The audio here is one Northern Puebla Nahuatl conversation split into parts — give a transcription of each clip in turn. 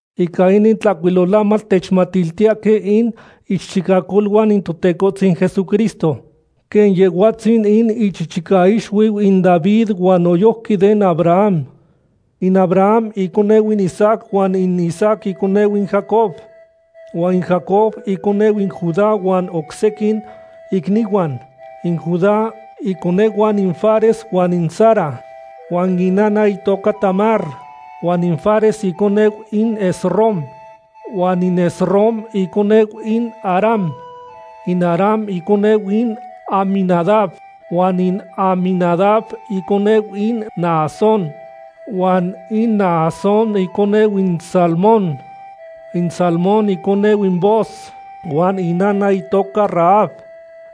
Ica inin tlahcuilolamatl techmatiltiyahque in ichichicacoluan in Totecohtzin Jesucristo, quen Yehhuatzin in ichichicaixuiu in David huan noyojqui den Abraham. In Abraham iconeu in Isaac huan in Isaac iconeu in Jacob, huan in Jacob iconehuan in Judá huan oc sequin icnihuan. In Judá iconehuan in Fares huan in Zara, huan in inana itoca Tamar. Huan in Fares iconeu in Esrom, huan in Esrom iconeu in Aram. In Aram iconeu in Aminadab, huan in Aminadab iconeu in Naasón, huan in Naasón iconeu in Salmón. In Salmón iconeu in Booz huan in inana itoca Rahab.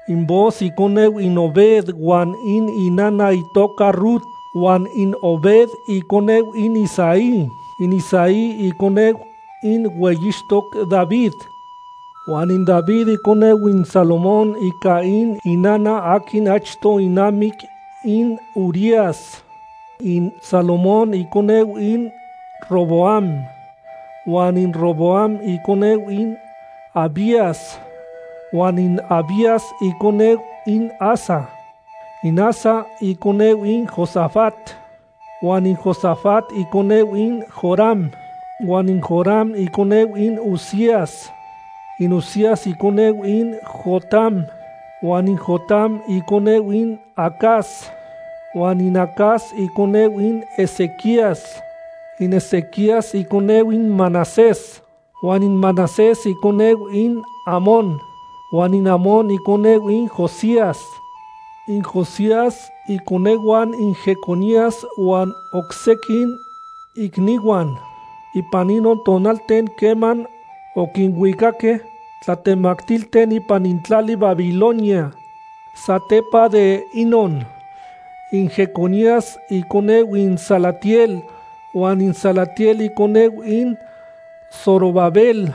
In Booz iconeu in Obed huan in inana itoca Rut. Huan in Obed iconeu in Isaí. In Isaí iconeu in hueyixtoc David, huan in David iconeu in Salomón ica in inana aquin achto inamic in Urías. In Salomón iconeu in Roboam, huan in Roboam iconeu in Abías, huan in Abías iconeu in Asa. In Asa iconeu in Josafat, huan in Josafat iconeu in Joram, huan in Joram iconeu in Uzías. In Uzías iconeu in Jotam, huan in Jotam iconeu in Acaz, huan in Acaz iconeu in Ezequías. In Ezequías iconeu in Manasés, huan in Manasés iconeu in Amón, huan in Amón iconeu in Josías. In Josías iconehuan in Jeconías huan oc sequin icnihuan, ipan inon tonalten queman oquinuicaque tlatemactilten ipan in tlali Babilonia. Satepa de inon, in Jeconías iconeu in Salatiel, huan in Salatiel iconeu in Zorobabel.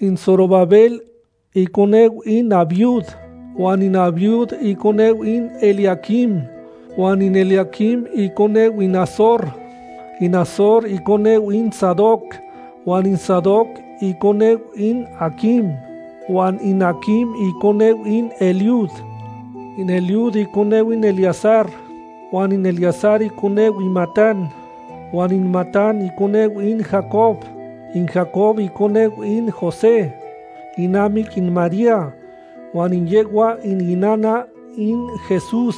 In Zorobabel iconeu in Abiud, huan in Abiud iconeu in Eliaquim, huan in Eliaquim iconeu in Azor. In Azor iconeu in Sadoc, huan in Sadoc iconeu in Aquim, huan in Aquim iconeu in Eliud. In Eliud iconeu in Eleazar, huan in Eleazar iconeu in Matán, huan in Matán iconeu in Jacob. In Jacob iconeu in José, inamic in María, huan yehhua in inana in Jesús,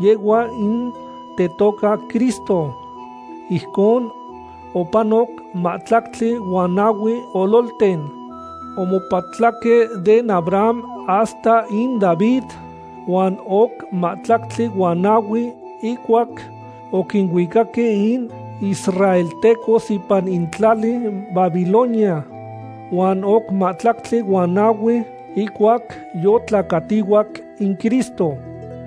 yehhua in tetoca Cristo. Ijcon opanoc mahtlactli huan nahui ololten omopatlaque den Abraham hasta in David, huan oc mahtlactli huan nahui ihcuac oquinuicaque in israeltecos ipan in tlali Babilonia, huan oc mahtlactli huan nahui ihcuac yotlacatihuac in Cristo.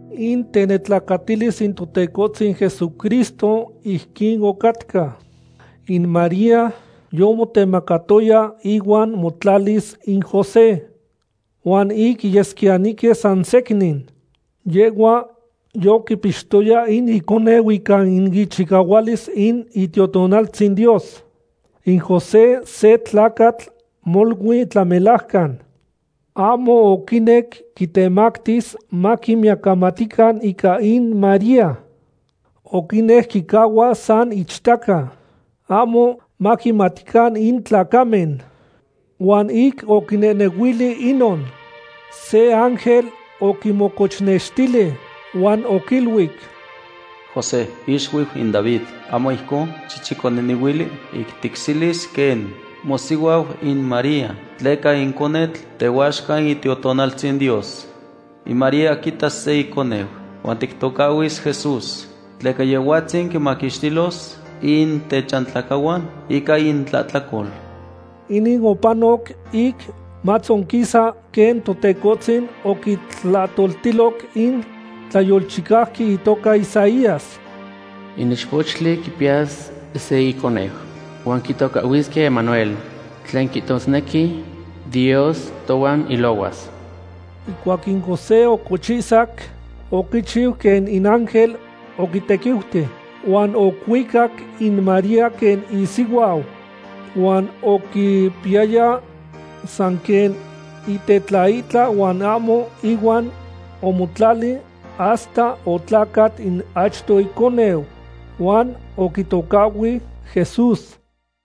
In tenetlacatilis in Totecohtzin Jesucristo ijquin ocatca. In María yomotemacatoya ihuan motlalis in José. Huan ic yesquiyanihque sansecnin, yehhua yoquipixtoya in iconeu ica in ichicahualis in Itiotonaltzin Dios. In José se tlacatl molui tlamelajcan. Ahmo oquinec quitemactis maquinmiyacamatican ica in María. Oquinec quicahua san ichtaca, ahmo maquimatican in tlacamen. Huan ic oquinehnehuili inon, se ángel oquimocochnextili huan oquiluic: ―José, ixuiu in David, ahmo ijcon xicchiconehnehuili ic ticselis quen mosihuau in María, tleca in conetl tehuaxca in Itiotonaltzin Dios. In María quiitas se iconeu, huan tictocahhuis Jesús, tleca Yehhuatzin quinmaquixtilos in techantlacahuan ica intlahtlacol. Inin opanoc ic matzonquisa quen Totecohtzin oquitlahtoltiloc in tlayolchicauqui itoca Isaías: In ichpochtli quipiyas se iconeu, huan quitocahhuisque Emanuel, tlen quihtosnequi: Dios tohuan ilohuas. Ihcuac in José ocochihsac, oquichiu quen in ángel oquitequiuti, huan ocuicac in María quen isihuau. Huan oquipiyaya san quen itetlaihtla huan ahmo ihuan omotlali hasta otlacat in achto iconeu, huan oquitocahhui Jesús.